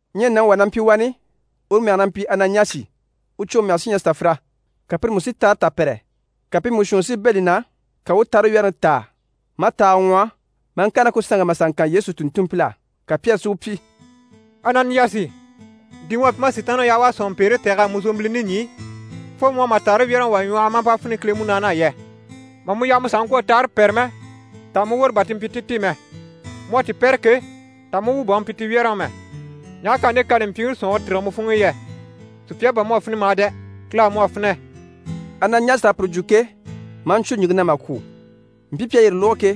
Ɲyɛ nàŋi wà na mpyi wani, uru mɛge na mpyi Ananiyasi, u cwoŋi mɛge sí ɲyɛ Safira, ka pire mú si taare tà pɛ́rɛ. Ka pi mú shuunni si bɛ̂ li na, ka u u taare wyɛ́rɛŋi táa, maa taaga ŋwɔhɔ, maa ŋkàre ná ku sanŋke e mà sà ŋkan Yesu tùnntunmpil'á. Ka Pyɛri si u pyi: «Ananiyasi, di mu à pyi maa Sitaanniŋi yaha u à sɔ̀nŋɔpeere tɛ̀g'a mu zòmbilini ɲî fo mu à ma taare wyɛ́rɛŋi wà ŋwɔhɔ maa mpa finɛ Kile Munaani á yɛ? Mà mu yaha mu sàha ŋkwɔ̀ a taare pɛ́rɛ mɛ, taha mu woro bà ti mpyi ti ti mɛ? Mu à ti pɛ́rɛ ke, taha mu wu bà u mpyi ti wyɛ́rɛŋi mɛ? Ɲaha k'à nde kani mpyiŋi sɔ̀nŋɔre tîrige mu funŋke e yɛ? Sùpya á bà mu à finɛ mà dɛ! Kile á mu à finɛ.» Ananiyasi à puru lógo ke, maa ɲcwo ɲìŋke na mà kwû. Mpii pi à yire lógo ke,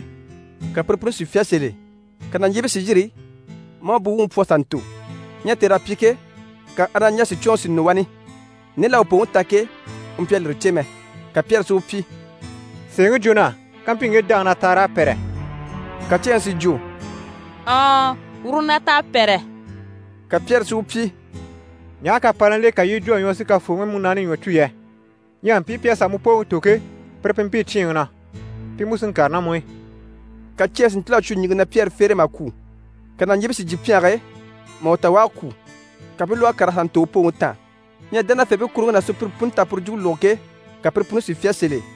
ka pire puni si fyá sèl'e. Ka nàɲjiibii si yîri maa u buwuŋi pwɔ a sà ntò. Ɲyɛ tèr'à pyi ke, ka Ananiyasi cwoŋi si nɔ wani, nde l'à u pooŋi ta ke, u mpyi a lire cè mɛ. Ka Pyɛri si u pyi: «Sèeŋi jwo na á, kampyi ŋge dáŋi na taar'à pɛ́rɛ.» Ka ceeŋi si jwo: «Ɔɔn, uru na t'à pɛ́rɛ.» Ka Pyɛri si u pyi: «Ɲaha k'à pa ná l'e, ka yii i jwo a ɲwɔ si Kafooŋi Munaani ɲwɔ cû yɛ? Ɲyɛ mpii pi à sà mu pooŋi tò ke, pire pi mpii cyíinŋi na, pi mú si n‑kàre ná mu i.» Ka ceeŋi si ntíl'a cwo ɲìŋke na Pyɛri fere e mà kwû. Ka nàɲjiibii si jyè pyɛnge e, mà u ta u à kwû. Ka pi i u lwɔ́ a kàr'a sà ntò u pooŋi taan. Ɲyɛ dánafeebii kuruŋke ná sùpyire puni t'à puru jwumpe lógo ke, ka pire puni si fyá sèl'e.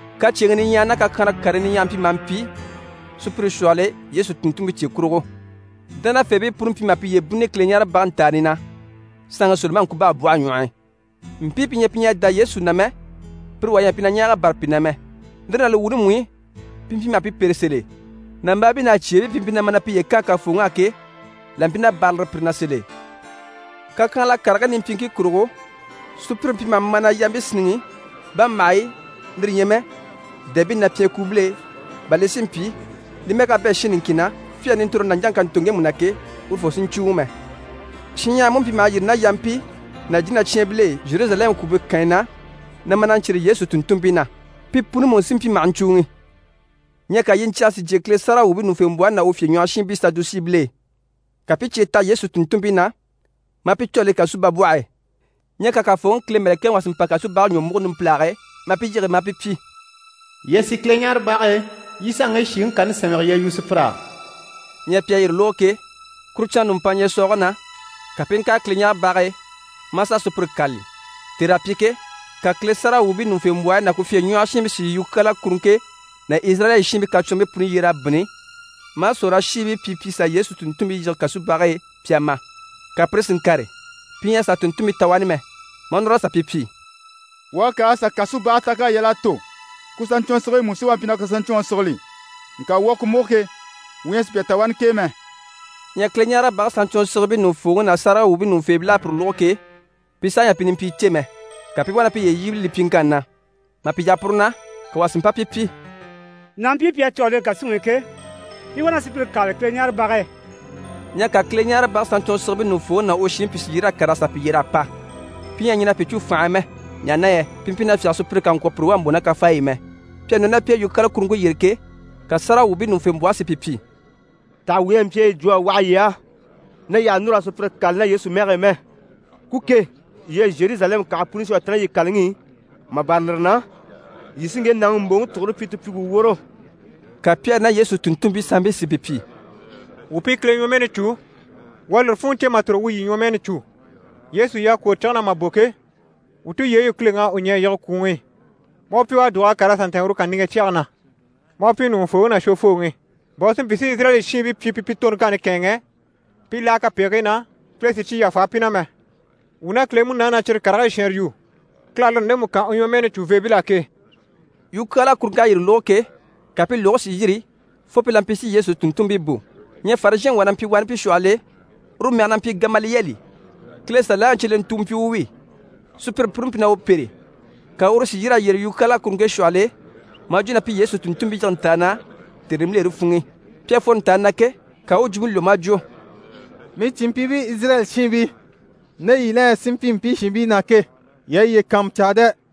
Kacyeeŋii niɲyahagii ná kakyanhala karii niɲyahagii mpyi maha mpyi sùpyire shwɔhɔl'e Yesu tùnntunmpii cye kurugo. Dánafeebii puni mpyi maha piye bínnini Kileɲaarebage ntàani na, saanŋi Solomani ŋkubabwɔhe ɲwɔh'i. Mpii pi ɲyɛ pi ɲyɛ a dá Yesu na mɛ, pire wà ɲyɛ a mpyi na ɲɛɛg'a bâra pi na mɛ. Lire ná li wuuni mú i, pi mpyi maha pi pêre sèl'e. Nàmbaabii ná cyeebii pi mpyi na ma na piye kaan Kafooŋi á ke, là mpyi na bârali pire na sèl'e. Kakyanhala karigii nimpyiiŋkii kurugo, sùpyire mpyi maha ma na yampii sínniŋi bàmbahaɲyi, lire ɲyɛ mɛ dèmɛbii na pyɛnkuubil'e, bà li si mpyi li mɛ́ɛ ka bɛ̂ shin niŋkin na, Pyɛri nintoroŋi nàɲjaŋi ká ntò ŋgemu na ke, urufoo si ɲcùuŋɔ mɛ. Shinɲyahara mú mpyi maha yîri ná yampii ná jínacyaanbil'e Zheruzalɛmu kwùumpe kànyi na, na ma na ɲcyêre Yesu tùnntunmpii na, pi puni mú sí mpyi maha ɲcùuŋi. Ɲyɛ ka yiɲcyɛge si jyè Kile sáragawwuubii ɲùŋufembwɔhe ná u fyèɲwɔhɔshiinbii Sadusiibil'e. Ka pi i cye taha Yesu tùnntunmpii na, maa pi cû a le kasubabwɔhe e. Ɲyɛ ka Kafooŋi Kile mɛ̀lɛkɛŋi wà si mpa kasubage ɲwɔ múgo numpilage e, maa pi yige, maa pi pyi: «Yii a sì Kileɲaarebage e, yii i sà a ŋge shìŋi kani sɛ́nmɛge yii a yu sùpyir'á.» Ɲyɛ pi à yire lógo ke, kuru canŋa nùmpanŋa ɲyɛ̀sɔɔge na, ka pi i ŋkàre Kileɲaarebage e, maa sà a sùpyire kâlali. Tèr'à pyi ke, ka Kile sáragawwuubii ɲùŋufembwɔhe ná u fyèɲwɔhɔshiinbii si yukyaala kuruŋke ná Izirayɛli shiinbii kacwɔnribii puni yyer'a bínni, maa sòrolashiibii pyi pi sà Yesu tùnntunmpii yige kasubage e, pi a ma. Ka pire si ŋkàre, pi ɲyɛ a sà tùnntunmpii ta wani mɛ, maa núr'a sà pi pyi: «Wuu à kàr'a sà kasubage ta k'à yal'a tò, ku saɲcwɔnsigibii mú si wá a mpyi na ku saɲcwɔnŋi sigili. Ŋka wuu à ku múgo ke, wuu ɲyɛ a sùpya ta wani k'e mɛ.» Ɲyɛ Kileɲaarebage saɲcwɔnsigibii ɲùŋufooŋi ná sáragawwuubii ɲùŋufeebil'à puru lógo ke, pi saha ɲyɛ a pi nimpyii cè mɛ, ka pi i wá na piye yíbili li pyiŋkanni na. Mà pi yaha puru na, ka wà si mpa pi pyi: «Nàmpii yii à cû a le kàsuŋi i ke, pi wá na sùpyire kâlali Kileɲaarebage e.» Ɲyɛ ka Kileɲaarebage saɲcwɔnsigibii ɲùŋufooŋi ná u shiinbii pìi si yîr'a kàr'a sà pi yyer'a pa. Pi ɲyɛ a ɲɛn'a pi cû fànhe e mɛ, ɲaha na yɛ pi mpyi na fyáge sùpyire kà ŋkwɔ̀ pire wà mbò ná kafaayi i mɛ. Pi à nɔ ná pi e yukyaala kuruŋke yyére ke, ka sáragawwuubii ɲùŋufembwɔhe si pi pyi: «Taha wuu ɲyɛ a mpyi a yi jwo a waha yii á na yii àha núru raa sùpyire kâlali ná Yesu mɛge e mɛ? Ku ke, yii à Zheruzalɛmu kànhe puni shwɔ a ta ná yii kàlaŋi i, mà bâra lire na, yii sí ŋge nàŋi mbòŋi tugure pyi ti pyi wuu woro.» Ka Pyɛri ná Yesu tùnntunmpii sanmpii si pi pyi: «Wuu pi Kile ɲwɔmɛɛni cû, wuu à lire funŋɔ cè mà tòro wuu yii ɲwɔmɛɛni cû. Yesu yii à kwòro cige na mà bò ke, wuu tulyeyi u Kileŋi à u ɲɛ̀ a yige kwùŋi i, maa u pyi u à dùg'a kàr'a sà ntɛ̀ɛn uru kàniŋɛ cyɛge na, maa u pyi Ɲùŋufooŋi ná Shwofooŋi, bà u si mpyi si Izirayɛli shiinbii pyi pi pi toroŋkanni kɛ̂ɛnŋɛ pi i láha kapegigii na, Kile si cyi yàfa pi na mɛ. Wuu ná Kile Munaani na cyire karigii shɛɛnre yu, Kile à lire ndemu kan u ɲwɔmɛɛni cùveebil'á ke.» Yukyaala kuruŋk'à yire lógo ke, ka pi lùgigii si yîri fo pi la mpyi si Yesu tùnntunmpii bò. Ɲyɛ Farizhɛnŋi wà na mpyi pi shwɔhɔl'e, uru mɛge na mpyi Gamaliyɛli, Kile Saliyaŋi cyelentu u mpyi u wi, sùpyire puni mpyi na u pêre, ka uru si yîr'a yyére yukyaala kuruŋke shwɔhɔl'e maa jwo na pi Yesu tùnntunmpii yige ntàani na tère nimbilere funŋ'i. Pi à fworo ntàani na ke, ka u u jwumpe lwɔ́ maa jwo: «Mii cìnmpyiibii Izirayɛli shiinbii, nde yii la ɲyɛ si mpyi mpii shiinbii na ke, yii a yiye kàanmucaa dɛ!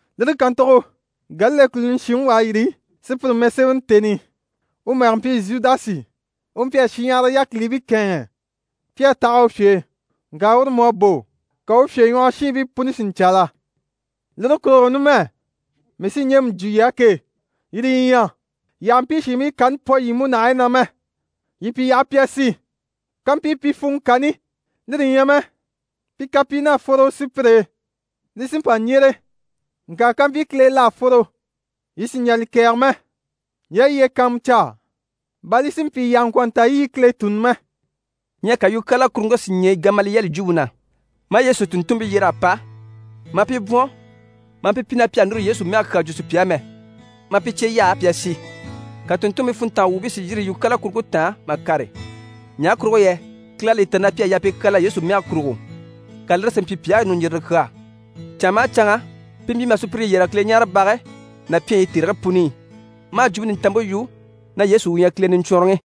Lire kàntugo Galile kùluni shinŋi wà à yîri sùpyire mɛsemɛni tèni i, uru nàŋi mɛge mpyi Zhudasi, u mpyi a shinɲyahara yákilibii kɛ̂ɛnŋɛ pi à taha u fye e. Ŋka uru mú à bò, ka u fyèɲwɔhɔshiinbii puni si ɲcaala. Lire kurugo numɛ, mii sí ɲjemu jwo yii á ke, yire yi ɲyɛ, yii àha mpii shiinbii kani pwɔ yii múnahigii na mɛ, yii pi yaha pi a sì. Kampyi pi funŋɔ kani, lire ɲyɛ mɛ pi kapyin'à fworo sùpyire e, li sí n‑pa n‑yyére. Ŋka kampyi Kile e l'à fworo, yii sì n‑jà li kɛ̀ɛgɛ mɛ. Yii a yiye kàanmucaa, bà li si mpyi yii àha ŋkwɔ̀ nta yii i Kile tùnni mɛ.» Ɲyɛ ka yukyaala kuruŋke si ɲɛɛ Gamaliyɛli jwumpe na, maa Yesu tùnntunmpii yyer'a pa, maa pi bwɔ̀n, maa pi pyi na pi àha núru Yesu mɛge kyaa jwo sùpya á mɛ, maa pi cye yaha pi a sì. Ka tùnntunmpii funntanga wuubii si yîri yukyaala kuruŋke taan mà kàre ɲaha kurugo yɛ Kile à li ta na pi à yaa pi kyaala Yesu mɛge kurugo, ka lire si mpyi pi á ɲùɲjirire kyaa. Canŋa maha canŋa, pi mpyi maha sùpyire yɛrɛge Kileɲaarebage ná pyɛnyi i tèrigii puni i, maa Jwumpe Nintanmpe yu na Yesu u ɲyɛ Kile Niɲcwɔnrɔŋi.